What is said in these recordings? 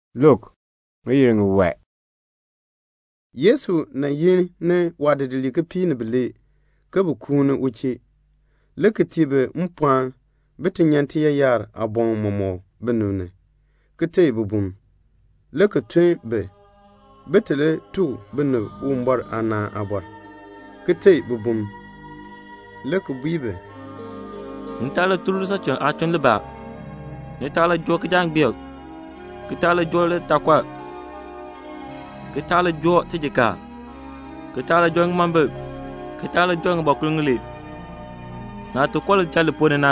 Le Yesu yi ni waadidiliib kipiik ni bilee ke bin kuuni u chee, le ki tii bi mpɔɔn bin ti nyan tiyaayar aaboŋ mɔmɔk binib ni, ki teei bibum; le ki tun bi, bin ti li tuk binib Uwumbɔr aanaan aabɔr, ki teei bibum, le ki bui bi, "Ni taa li tun lisachuln aatuln libaa. Ni taa li joo kijangbeek, ki taa li joo litaakɔr, ki taa li joo tijikaar, ki taa li joo ŋimombil, ki taa li joo ŋibɔkur ŋilee. Naah ti koo lidichal li ponn ni na,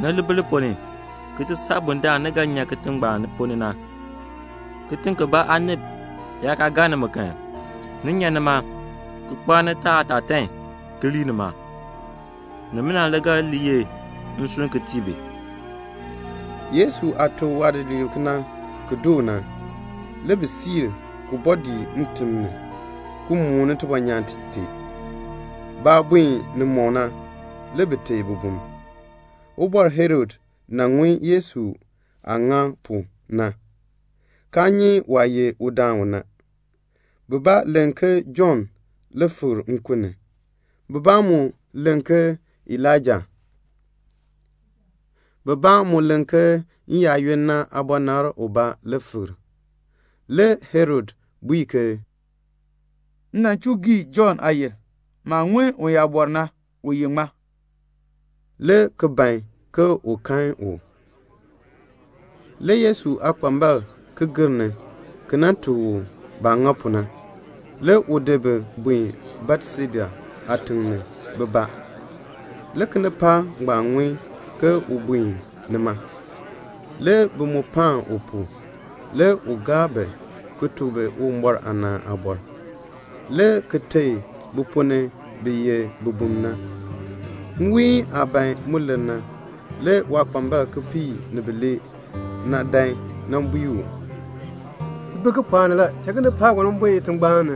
ni li bi li ponn ni ki ti saa bundaln ni ga nyan kitiŋ ngbaan ponn ni na. Kitiŋ kibaa aanib yaa kaa gaa nimi kan, ni nyan nima ki kpaar nitaa aatatan ki lii nima. Nimina le ga li ye nsurm ki tii bi." Yesu aah tuk waadidiliib kena ki doo na, le bi buen, le ki bɔɔ dii ntim ni, ki mooni tibɔnyaan tee. Baah buen nimɔk na, le bi teei bibum. Le Ubɔr Herod ŋun Yesu aah ŋa pu na, kaa nyi waah ye udaan u na. Bibaa len ke Jɔnn fikr nkun ni, bibaa mu len ke Elaija, bibaa mu len ke n-yaayoonn na aabɔnabr ubaa le fikr. Le Herod bui ke "M nan chuu gii Jɔnn aayil. Maah ŋun uyaabɔr na, u ye ŋmaa?" le ki ban ke un kan u. Le Yesu aakpambalb ki gir ni, le ki tuk u baah ŋa pu na. Le u di bi buen Betseda aatiŋ ni, bibaa. Le kinipaak ngbaan ŋun ke u buen nima. Le bi mu paan u pu. Le u gaa bi, le ki tuk bi Uwumbɔr aanaan aabɔr, le ki teei bi ponn ni bi ye bibum na. Nwiin aah ban mu lir na, le waakpambalb kipiik ni bilee dan nan bui u, "Ti bi kipɔɔk ni la; tun kinipaak ngbaan bin buen itingbaan ni,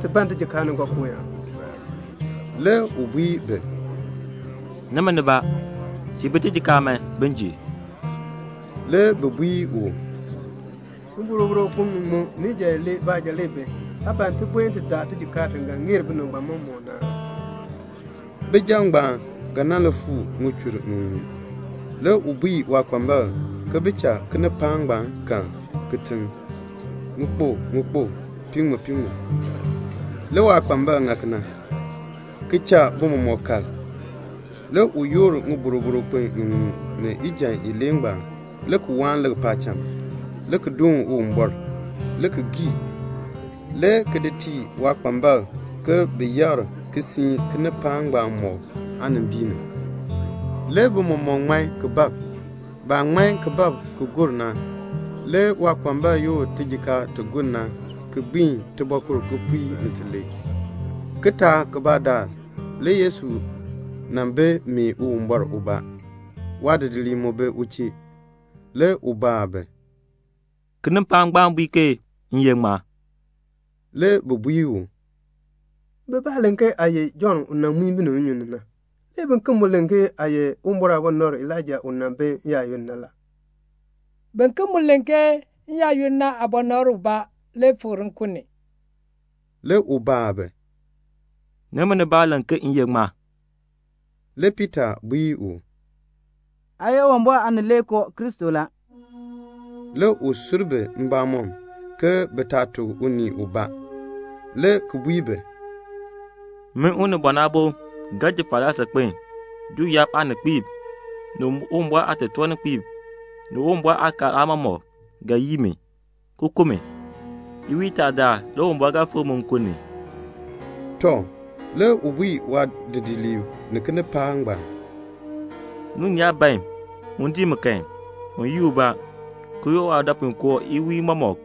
ki ban tijikaar ni nkookooyaan." Le u bui bi, "Nimi, tiin bi tijikaar man, bin ji." Le bi bui u, "Ŋiboroboro kpin ŋiŋmu ni ijan ilee baanja le bi. Aa ban ke ti buen ti daa tijikaar ti ga ŋeer binib ngbaan mɔmɔk na aa?" Bijab ngbaan ga nan li fuu ŋichur ŋiŋmu. Le u bui waakpambalb ke bi cha kinipaak ngbaan kal kitiŋ ŋikpuk ŋikpuk, piiŋmu piiŋmu. Le waakpambalb ŋa kena, ki cha bi mɔmɔk kal. Le u yoor ŋiboroboro kpin ŋiŋmu ni ijan ilee ngbaan le ki waan lik paacham, le ki doon Uwumbɔr, le ki gii, le ki di tii waakpambalb ke bin yakr ki siin kinipaak ngbaan mɔk aanimbiin ni. Le bi mɔmɔk ŋman ki bab. Baah ŋman ki bab ki gur na, le waakpambalb yoor tijikaar ti gur na, ki gbiin tibɔɔkur kipiik ni tilee. Kitaak kibaa daal le Yesu nan bi mee Uwumbɔr ubaa. Waadidiliib mu bi u chee. Le u baa bi, "Kinipaak ngbaan bui ke m ye ŋmaa?" Le bi bui u, "Bibaa len ke aa ye Jɔnn u nan muin binib nnyun ni na, le biken mu len ke aa ye Uwumbɔr aabɔnabr Elaija u nan bi n-yaayoonn na la, le biken mu len ke n-yaayoonn na aabɔnabr ubaa fikr le nkun ni." Le u baa bi, "Nimi, ni len ke m ye ŋmaa?" Le Piita bui u, "Aa ye Uwumbɔr Aanileekoo Kristo la." Le u sur bi mbamɔm ke bi taa tuk unii ubaa, le ki bui bi, "Min Unibɔn Aabo ga ji falaa saakpen. Juu yaab aaninkpiib, ni Uwumbɔr aatotoorninkpiib, ni Uwumbɔr aakaal aamɔmɔkb ga yii mi, ki ku mi. Iwiin itaa daal le Uwumbɔr ga fikr mi nkun ni." Tɔ, le u bui waadidiliib ni kinipaak ngbaan, "Unii yaa ban un dii mi kan, un yii ubaa, ki yoor waadɔpuinkoo iwiin mɔmɔk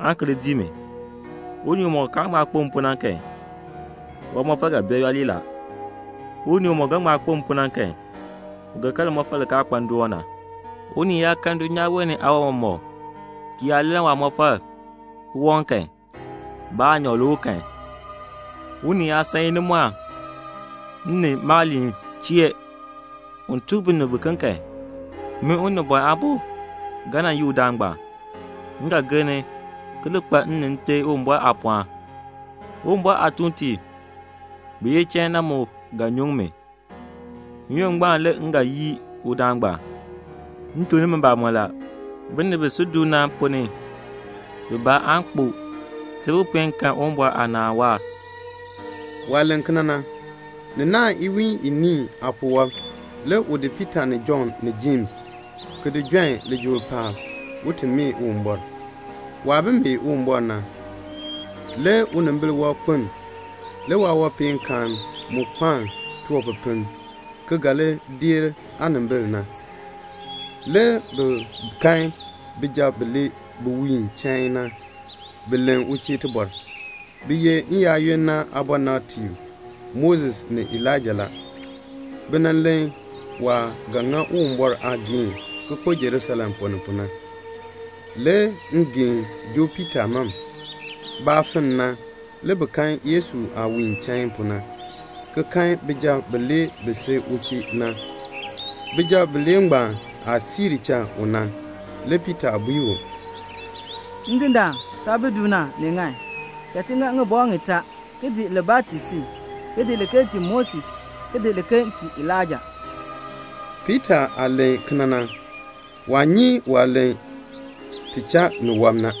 aan ki li dii mi. Unii umɔk kaan ŋma kpo m pu na kan, waamɔfal ga bee yooli la. Unii umɔk ga ŋma kpo m pu na kan, u ga kan limɔfal li kaa kpa ndoon na. Unii yaa kan dulnyaa wee ni aawan mɔmɔk, ki lann waamɔfal ki waŋ kan, ba aanyoor le u kan? Unii yaa san inimɔɔn m ni maaliin chee un tuk binib kan, min Unibɔn Aabo ga nan yii udaan ngbaan. M ga gir ni, ki li kpa m ni Nte Uwumbɔr aapɔɔn. Uwumbɔr aatuuntiib bi ye chain na mu ga nyuŋ mi. N-yoonn ngbaan le m ga yii udaan ngbaan. M tuk nimi mbamɔn la, binib bi si du na ponn ni bibaa aan kpo see bi puen kan Uwumbɔr aanaan waahr." Waah len kena na, ni naahn iwiin iniin jer. Le u di Piita ni Jɔnn ni Jems, ki di jon lijool paab, un ti mee Uwumbɔr. Waah bi mee Uwumbɔr na, le unimbil wɔb kpeln. Le waawanpeenkaan mu kpaln tiwanpipiln, ni ga li deer aanimbil na. Le bi kan bijab bilee bi wiin chain na, bi len u chee tibɔr. Bi ye n-yaayoonn na aabɔnabtiib Moses ni Elaija la. Bi len waah ga gbiin Uwumbɔr aageehn ki kpo Jerusalem ponn ni pu na. Le ngeen joo Piita mam. Baah finn na, le bi kan Yesu aah wiin chain pu na, ki kan bijab bilee ngbaan bi si u chee na. Bijab bilee ngbaan aah siir cha u na, le Piita bui u, "Ndindaan, taah bi du na, ni ŋan. Cha ti ŋa ŋibɔk ŋitaa, ki di libaa ki tii si, ki di liken ki tii Moses, ki di liken ki tii Elaija." Piita aah len kena na, waa nyi waah len ti cha ni wɔb na.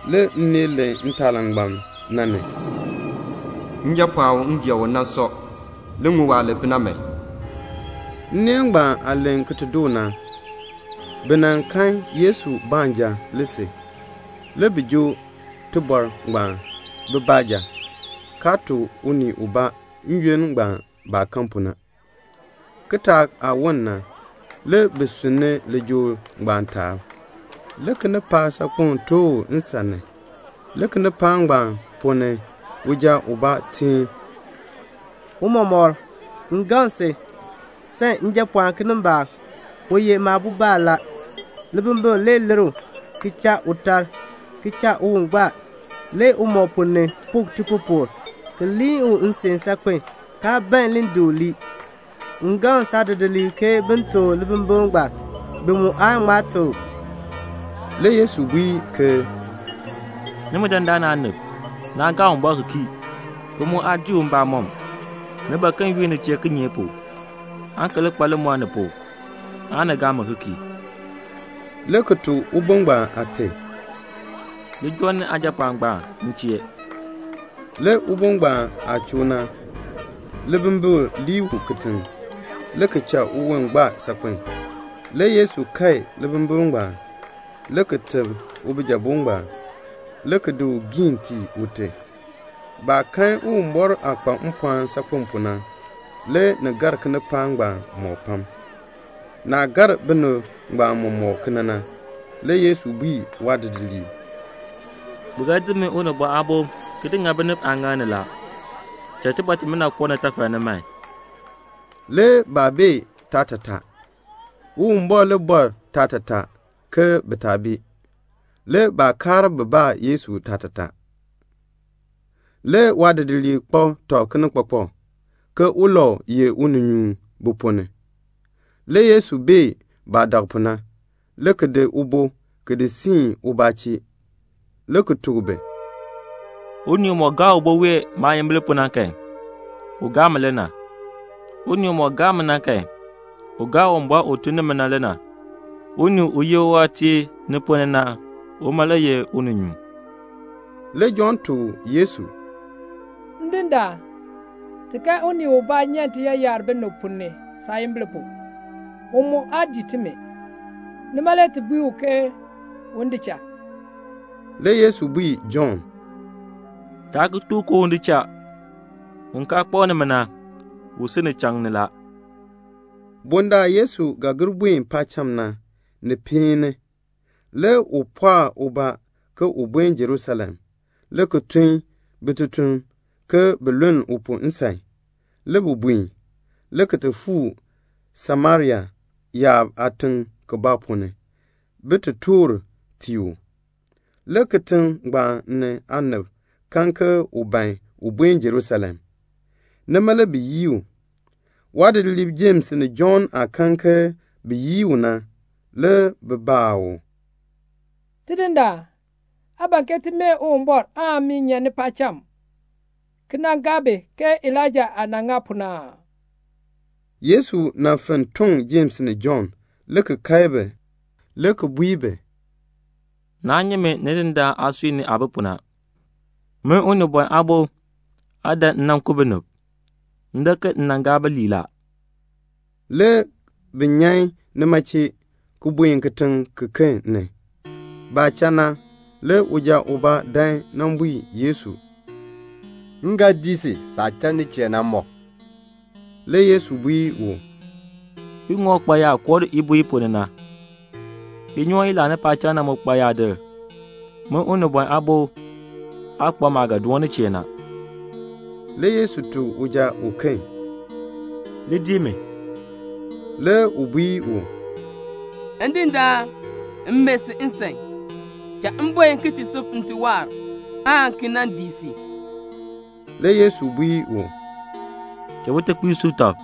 Le nneel len ntaalangbam na ni, "Njapɔɔn u m gee u na sɔ. Li ŋun waah len pu na man." Nneel ngbaan aah len ki ti doo na, le bi kan Yesu baanja. Le bi joo tibɔr ngbaan bi baanja, kaa tuk unii ubaa n-yoonn ngbaan baah kan pu na. Le ni woln kitaak le bi sunn ni lijool ngbaan taab. Le kinipaak saakpeŋ tooh u nsan ni. Le kinipaak ngbaan ponn ni uja ubaa teen, "Tiicha, m gaŋ si, sam njapɔɔn kinimbaak. U ye maabobaan la. Libimbikl le lir u ki cha u tar, ki cha uwon gbaa, le umɔb ponn ni puk tipupukr, ki liin u nsin saakpen, kaa ban li di u lii. M gaŋ saadidiliib ke bin teb u libimbikl ngbaan. Bi mu aa ŋma teb u." Le Yesu bui ke "Nimi dandana aanib, naa gaa Uwumbɔr ki kii, ki mu aa dii u mbamɔm. Ni ban ke m yunn ni chee kinye pu, aan ki li kpa limɔr ni pu, aan ni gaa mi ki kii?" le ki tuk ubo ngbaan aate, "Li joo ni aajapɔɔn ngbaan m chee." Le ubo ngbaan aah choo na, libimbikl lii u kitiŋ, le ki cha uwon gbaa saakpen. Le Yesu kae libimbikl ngbaan, le ki teb ubijabo ngbaan, le ki di u giin tii ute. Baah kan Uwumbɔr aah kpa mpɔɔn saakpen pu na, le ni gar kinipaak ngbaan mɔk pam. Naah gar binib ngbaan mɔmɔk kena na, le Yesu bui waadidiliib, "Bi ga di min Unibɔn Aabo ki di ŋa binib aaŋaal ni la. Cha iliin imina koo nitafal ni man." Le baa bee yaatataa. Uwumbɔr le bɔr yaatataa, ke bi taa bee. Le baa kaar bin baa Yesu yaatataa. Le waadidiliib kpak tɔb kinikpakpak ke ulau ye uninyuun bi ponn ni. Le Yesu bee baah dak pu na, le ki di ubo ki di siin ubaa chee, le ki tuk bi, "Unii umɔk gaa ubo wee maayimbil pu na kan, u gaa mi le na. Unii umɔk gaa mi na kan, u gaa Uwumbɔr u tun ni mi na le na. Unii u ye uwaatiir ni ponn ni na, uma le ye uninyuun." Le Jɔnn tuk Yesu, "Ndindaan, ti kan unii ubaa nyan tiyaayar binib ponn ni saayimbil pu. U mu aa dii timi, nima le ti bui u ke un di cha." Le Yesu bui Jɔnn, "Taa ki tuk u ke un di cha. Un kaa kpak nimi na, u si ni pu la." Bundaln Yesu ga gir buen paacham na, ni peen ni. Le u pɔɔ uwon ke un buen Jerusalem, le ki tun bitutum ke bin luln u pu nsan. Le bi buen, le ki ti fuu Samaria yaab aatiŋ kibaa ponn ni, bin ti toor tii u. Le kitiŋ ngbaan aanib kan ke u ban un buen Jerusalem. Nima le bi yii u. Le waadidiliib Jems ni Jɔnn aah kan ke bi yii u na le bi baa u, "Tidindaan, aa ban ke ti mee Uwumbɔr mmii nyan paacham ki gaa bi ii? [ke Elaija aah nan ŋa pu na]" Le Yesu fenn toŋ Jems ni Jɔnn le ki kae bi, [le ki bui bi, "Naa nyi Min Nidindaan aasui ni aah bi pu na. Min Unibɔn Aabo aa dan m nan ku binib. M dan ke bin ŋmar la."] Le bi nyan nima chee, ki buen kitiŋ kiken ni. Le baah cha na, uja ubaa dan nan bui Yesu, "M ga dii si saah cha nin chee na mɔk." Le Yesu bui u, "Iŋɔk kpa yaa koo ibuu i ponn ni na. Inyoon i laani paacham na mu kpa yaadir. Min Unibɔn Aabo aa kpa maah ga doon nin chee na." Le Yesu tuk uja uken, "Li dii mi." Le u bui u, "Ndindaan, m mee si nsan, cha m buen ti sub nte waahr, aan ki nan dii si." Le Yesu bui u, "Cha bitekpiib sub tɔb.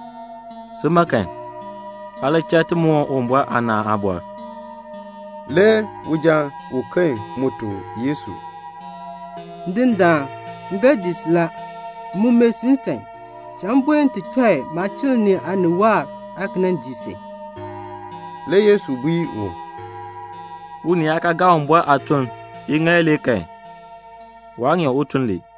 Si, aa li cha ti moon Uwumbɔr aanaan aabɔr." Le uja uken mu tuk Yesu, "Ndindaan, m ga dii si la. M mu mee si nsan, cha m buen ti chɔi maachiln ni aanib waahr, aan ki nan dii si." Le Yesu bui u, "Unii yaa kaa gaa Uwumbɔr aatuln iŋaal ilee kan, waa ŋeer un tun li."